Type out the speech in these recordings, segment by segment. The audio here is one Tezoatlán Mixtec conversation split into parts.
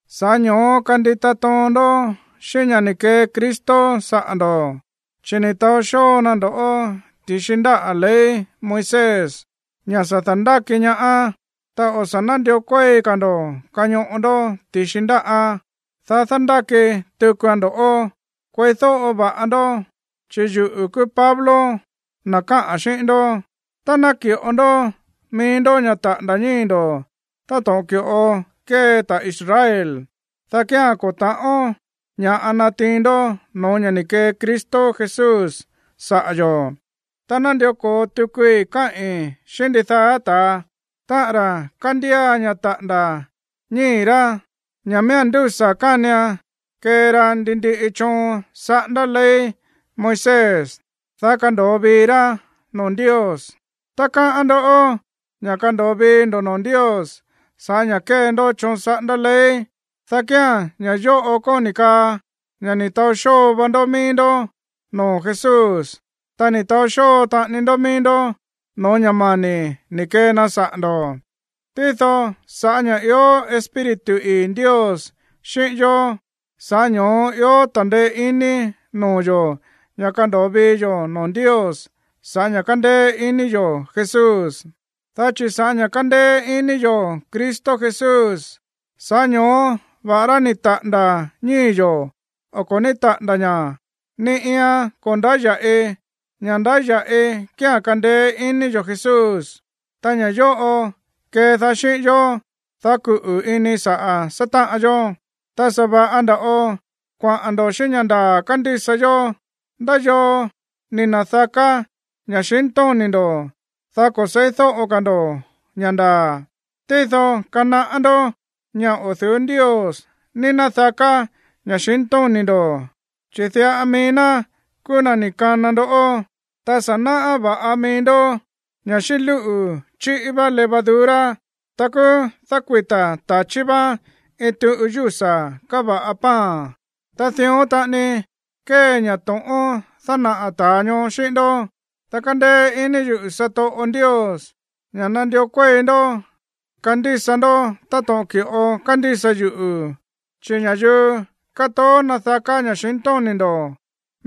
Sa̱ꞌá ño̱ó kandita toon ndó xíꞌín ña̱ ni̱ kee Cristo saꞌa̱ ndo̱, chi̱ ni̱ taó xóo na ndo̱ꞌó ti̱xi ndáꞌa̱ ley Moisés, ña̱ sa̱ da̱ndáki ñaá. Ta o̱ sa̱ nándió kuéi ka̱ ndo̱ kañoꞌo ndó ti̱xi ndáꞌán, dá dándáki tukuan ndo̱ꞌó. Kueídóꞌo va̱ꞌa ndó, chi̱ yuꞌu̱ kúú Pablo, na̱ káꞌa̱n xíꞌín ndó. Tá ná naki̱ꞌo ndó mií ndó ña̱ taꞌa̱nda̱ ñíi̱ ndo̱ táto̱ꞌon ki̱ꞌo kée ta̱ Israel, dá kía̱n ko̱ ta̱ꞌón ña̱ꞌa natiin ndó no̱ó ña̱ ni̱ kee Cristo Jesús saꞌa̱ yo̱. Ta nándió ko̱o tukui káꞌi̱n xíꞌín ndidaá ta̱a, táꞌa̱n ra̱ kándía ña̱ taꞌa̱nda̱ ñíi̱ rá, ña̱ miía̱n ndúsa̱ kánian kee ra ndi ndiꞌi choon saꞌándá ley Moisés, dá kando̱o vii rá noo̱ Ndios. Tá káꞌán ndó ña̱ kando̱o vii ndo̱ noo̱ Ndios sa̱ꞌá ña̱ kée ndó choon saꞌándá ley, dá kía̱n ña̱ yóꞌo kóni̱ kaa ña̱ ni̱ taó xóo va ndó mií ndó noo̱ Jesús, ta ni̱ taó xóo taꞌani ndó mií ndó no̱ó ña̱ mani̱ ni̱ kee na saꞌa̱ ndo̱. Tído sa̱ꞌá ña̱ ió Espíritu ii̱ Ndios xíꞌín yó, sa̱ꞌá ño̱ó ió ta̱ndeé iní noo̱ yo̱ ña̱ kando̱o vii yo̱ noo̱ Ndios sa̱ꞌá ña̱ kándéé iní yo̱ Jesús. Dá chi̱ sa̱ꞌá ña̱ kándéé iní yo̱ Cristo Jesús, sa̱ꞌá ño̱ó va̱ꞌará ni̱ taꞌa̱nda̱ ñíi̱ yo̱ o ko̱ ní taꞌa̱nda̱ ña̱, ni iian ko̱ ndáya̱ꞌi. Ña̱ ndáya̱ꞌi kía̱n kándéé iní yo̱ Jesús, ta ña̱ yóꞌo kédaá xíꞌín yó, dá kuꞌu̱ ini saꞌa̱ sátáꞌan yó. Ta sa̱ va̱ꞌa nda̱ꞌo kuaꞌa̱n ndo̱ xíꞌín ña̱ ndaa̱ kándísa yó. ¿Ndá yoo ni̱ na̱daká ña̱xintóni̱ ndo̱, dá ko̱ se̱ídóꞌo ka̱ ndo̱ ña̱ ndaa̱? Tído kanaꞌá ndó ña̱ o̱ du̱ú Ndios ní nádaká ña̱xintóni̱ ndo̱, chi̱ diꞌa mií ná kúú na̱ ni̱ kana ndo̱ꞌó. Ta sa̱ náꞌá va̱ꞌa mií ndó ña̱ xíꞌín lúꞌu̱ chíꞌí vá levadura, ta kúú dákuita̱ ta̱chí vaan iin tuꞌu yúsa̱ káva̱ꞌa pan. Ta dión taꞌani kée ña̱ to̱ꞌón dánaꞌa̱ ta̱a ñoó xíꞌín ndó. Ta kándéé iní yuꞌu̱ satoꞌo yo̱ Ndios ña̱ nandió kuéi ndó kandísa ndó táto̱ꞌon ki̱ꞌo kándísa yuꞌu̱. Chi̱ ña̱yuu kátoó nádaká ña̱xintóni̱ ndo̱,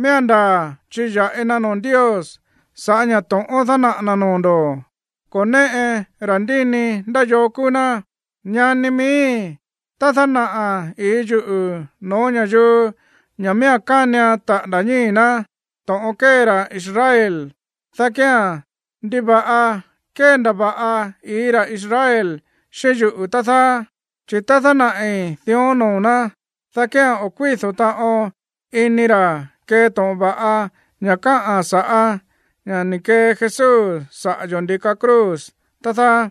miía̱n ndaa̱ chiya̱ꞌi na noo̱ Ndios sa̱ꞌá ña̱ to̱ꞌón dánaꞌa̱ na̱ noo̱ ndo̱. Ko̱ néꞌe ta̱ndíni ndá yoo kúú ná. Ñani miíi̱, tá dánaꞌa̱ i̱í yuꞌu̱ no̱ó ña̱yuu ña̱ miía̱n kánian taꞌa̱nda̱ ñíi̱ ná to̱ꞌon kée ra̱ Israel, dá kía̱n, ¿ndiva̱ꞌa kéndava̱ꞌa i̱í ra̱ Israel xíꞌín yuꞌu̱, tá dáá? Chi̱ tá dánaꞌi̱ dión noo̱ ná, dá kía̱n o̱ kuído̱ taꞌon ini ra̱ kee to̱ꞌon va̱ꞌa ña̱ káꞌa̱n sa̱ꞌá ña̱ ni̱ kee Jesús saꞌa̱ yo̱ ndi̱ka cruz, tá dáá.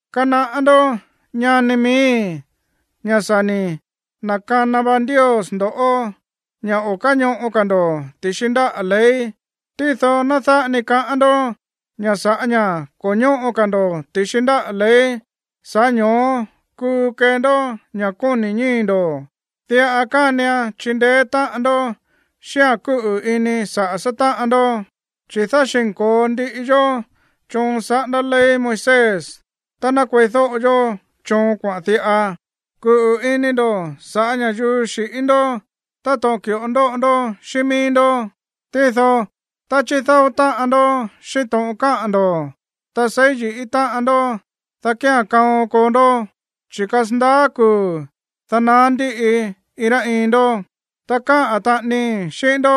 Kanaꞌá ndó, ñani miíi̱, ña̱ sa̱ ni̱ na̱kana va Ndios ndo̱ꞌó ña̱ o̱ káñoꞌo ka̱ ndo̱ ti̱xi ndáꞌa̱ ley. Tído ná dáꞌa ni kaꞌán ndó ña̱ sa̱ꞌá ña̱ ko̱ ñóꞌo ka̱ ndo̱ ti̱xi ndáꞌa̱ ley, sa̱ꞌá ño̱ó kuu kee ndó ña̱ kóni̱ ñíi̱ ndo̱. Diꞌa kánian chindeé táꞌan ndó xíꞌa̱n kúꞌu̱ ini saꞌa̱ sátáꞌan ndó. Chi̱ dáxi̱nko̱o ndiꞌi yó choon saꞌándá ley Moisés tá ná kueídóꞌo yó choon kuaꞌa̱n diꞌa: “Kuꞌu̱ ini ndo̱ saꞌa̱ ña̱yuu xi̱ꞌín ndó táto̱ꞌon ki̱ꞌo ndóꞌo ndó xíꞌín míí ndó.” Tído tá chídáó táꞌan ndó xíꞌín to̱ꞌon káꞌa̱n ndo̱, ta seí yi̱ꞌí táꞌan ndó, dá kía̱n kaon koo ndó, chi̱ kasandaá kuu̱, dá naá ndíꞌi iin rá iin ndó. Ta káꞌa̱n taꞌanii xíꞌín ndó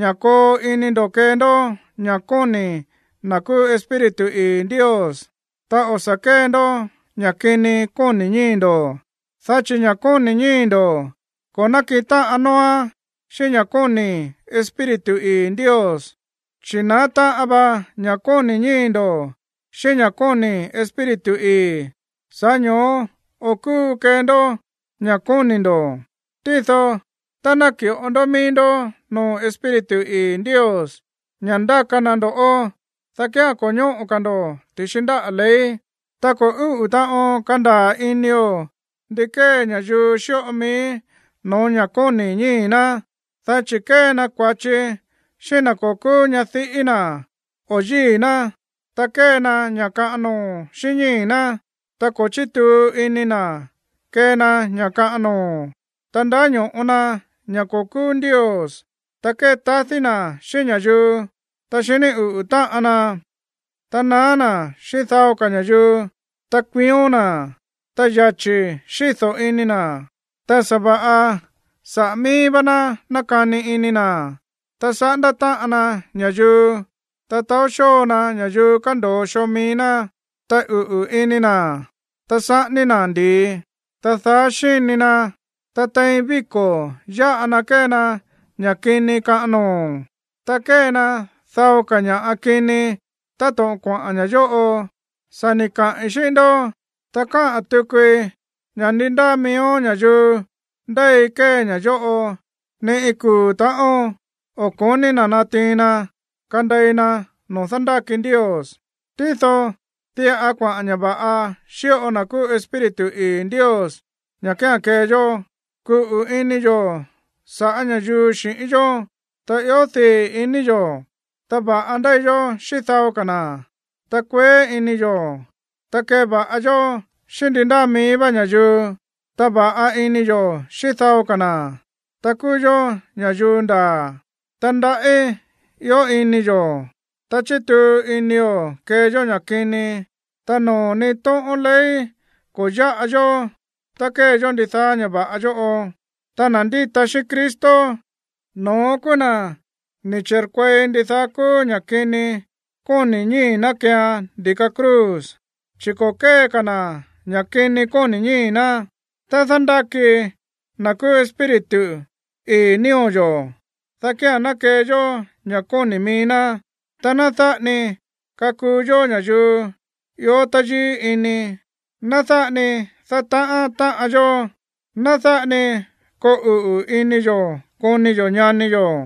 ña̱ koo ini ndo̱ kee ndó ña̱ kóni̱ na̱ kúú Espíritu ii̱ Ndios, ta o̱ sa̱ kée ndó ña̱ kini kóni̱ ñíi̱ ndo̱. Dá chi̱ ña̱ kóni̱ ñíi̱ ndo̱ ko̱ nákiꞌin táꞌan nóóán xíꞌín ña̱ kóni̱ Espíritu ii̱ Ndios, chi̱ naá táꞌan va ña̱ kóni̱ ñíi̱ ndo̱ xíꞌín ña̱ kóni̱ Espíritu ii̱. Sa̱ꞌá ño̱ó o̱ kúu kee ndó ña̱ kóni̱ ndo̱. Tído tá naki̱ꞌo ndó mií ndó noo̱ Espíritu ii̱ Ndios ña̱ ndaka na ndo̱ꞌó, dá kía̱n ko̱ ñóꞌo ka̱ ndo̱ ti̱xi ndáꞌa̱ ley. Ta ko̱ úꞌu̱ taꞌon kandaa̱ inio̱ ndi kée ña̱yuu xíꞌo mií no̱ó ña̱ kóni̱ ñíi̱ ná, dá chi̱ kée na kua̱chi xíꞌín na̱ ko̱ kúú ñadiꞌí na̱ o yíi̱ ná, ta kée na ña̱ kaꞌan noo̱ xíꞌín ñíi̱ ná, ta ko̱ chítuu ini na̱ kee na ña̱ kaꞌan noo̱. Ta ndáño̱ꞌo na ña̱ ko̱ kúú ndios, ta kétadí na̱ xíꞌín ña̱yuu, ta xiní uꞌu̱ táꞌan na, ta naá na̱ xíꞌín dao ka̱ ña̱yuu, ta kuión na̱, ta yachi̱ xído̱ ini na̱, ta sa̱va̱ꞌa saꞌa̱ míí vá ná nákani ini na̱, ta saꞌándá táꞌan na ña̱yuu, ta taó xóo na ña̱yuu kando̱o xoo mií ná, ta uꞌu̱ ini na̱, ta saꞌání na̱ ndi̱i, ta daá xíni na, ta tein víko̱ yáꞌa na kée na ña̱ kini kaꞌan noo̱. Ta kée na dao ka̱ ña̱ꞌa kini táto̱ꞌon kuaꞌa̱n ña̱ yóꞌo. Sa̱ ni̱ kaꞌi̱n xíꞌín ndó, ta káꞌa̱n tukui ña̱ ndi ndáa miíó ña̱yuu ndéi kée ña̱ yóꞌo, ni iin kuu̱ ta̱ꞌón o̱ ko̱ní na̱ natiin na kandei na no̱ó dándáki Ndios. Tído diꞌa kuaꞌa̱n ña̱ va̱ꞌa xíꞌo na̱ kúú Espíritu ii̱ Ndios ña̱ kía̱n kee yó: kúꞌu̱ ini yo̱ sa̱ꞌá ña̱yuu xi̱ꞌín yó, ta ió dii̱ ini yo̱, ta va̱ꞌa ndéi yó xíꞌín dao ka̱ na̱, ta kueé ini yo̱, ta kéva̱ꞌa yó xíꞌín ndi ndáa mií vá ña̱yuu, ta va̱ꞌa ini yo̱ xíꞌín dao ka̱ na̱, ta kúú yó ña̱yuu ndaa̱, ta ndaꞌí ió ini yo̱, ta chítuu inio̱ kee yó ña̱ kini. Ta noo̱ ni iin tóꞌón ley ko̱ yáꞌa yó tá kée yó ndidaá ña̱ va̱ꞌa yóꞌo. Ta na̱ ndíta xíꞌín Cristo, no̱ón kúú na̱ ni̱ chi̱rkuei ndidaá kúú ña̱ kini kóni̱ ñíi̱ ná keean ndi̱ka cruz, chi̱ ko̱ kée ka̱ na̱ ña̱ kini kóni̱ ñíi̱ ná. Tá dándáki na̱ kúú Espíritu ii̱ nío̱ yo̱, dá kía̱n ná kee yó ña̱ kóni̱ mií ná. Ta ná dáꞌa ni kakuu yó ña̱yuu ió táyíí ini. Ná dáꞌa ni dátaꞌán táꞌan yó. Ná dáꞌa ni koo uꞌu̱ ini yo̱ koni yo̱ ñani yo̱.